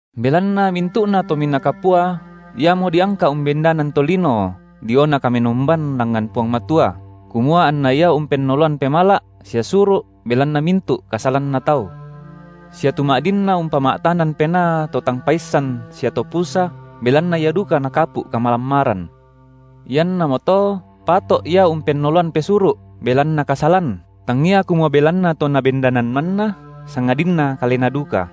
Belanna mintu’na tominaa kapua iamo diangka’ umbendanan tolino diona kamenomban langngan Puang Matua, kumua anna ia umpennoloan pemala’ sia suru’ belanna mintu’ kasalanna tau; sia tu ma’dinna umpama’tanan penaa to tang paissan sia to pusa, belanna ia duka nakapu’ kamalammaran; iannamoto pato’ ia umpennoloan pesuru’ belanna kasalan, tangia kumua belanna to nabendanan manna, sangadinna kalena duka.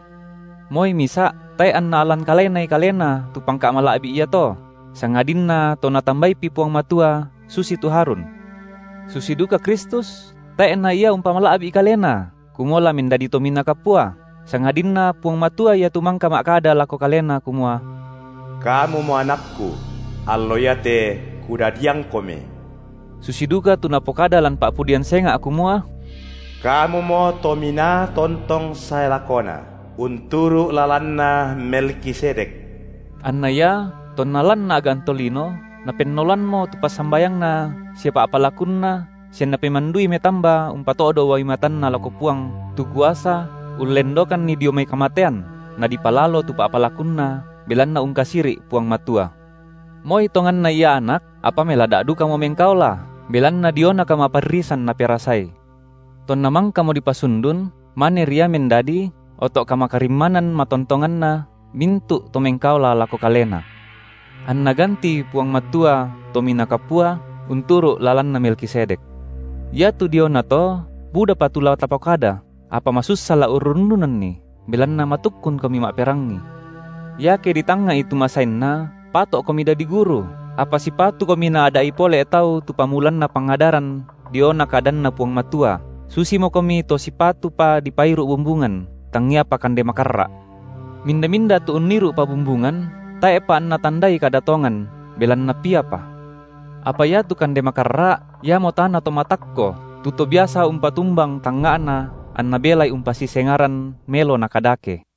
Moi misa’ tae’ anna alan kalenai kalena tu pangka’ mala’bi’ iato, sangadinna to Natambaipi Puang Matua susitu Harun. Susi duka Kristus tae’ na Ia umpamala’bi’ Kalena kumua la mendadi Tominaa Kapua, sangadinna Puang Matua Ia tu mangka ma’kada lako Kalena kumua: Kamumo AnakKu; allo iate KudadiangKomi, susi duka tu Napokada lan pa’pudian senga’ kumua: Kamumo Tominaa tontong sae lakona, unturu’ lalanna Melkisedek. Anna Ia, tonna lan a’gan tolino, Napennoloammo tu passambayangNa sia pa’palakunNa sia Napemandui metamba umpato’do uai matanNa lako Puang tu kuasa ullendokanNi dio mai kamatean, nadipalalo tu pa’palakunNa, belanna ungkasiri’ Puang Matua; moi tonganna Ia Anak apa melada’ dukamo mengkaola, belanna diona kamparrisan Naperasai. Tonna mangkamo dipasundun maneri Ia mendadi oto’ kamakarimmanan matontonganna mintu’ to mengkaola lako Kalena, anNa gantii Puang Matua Tominaa Kapua unturu’ lalanna Melkisedek. Iatu diona to, budapa tu la tapokada, apa masussa la urrundunanni, belanna matukkunkomi ma’perangi. Iake ditangnga’i tu masainna, pato’komi dadi guru, apa sipatukomi naada’i pole tau tu pamulanna pangadaran diona kadanNa Puang Matua; susimokomi to sipatupa dipairu’ bumbungan, tangiapa kande makarra’. Minda-minda tu unniru’pa bumbungan, tae’pa anna tandai kada tongan, belanna piapa. Apa iatu kande makarra’, iamo taana to matakko, tu to biasa umpatumbang tangnga’na anna belai umpasisengaran melo na kadake.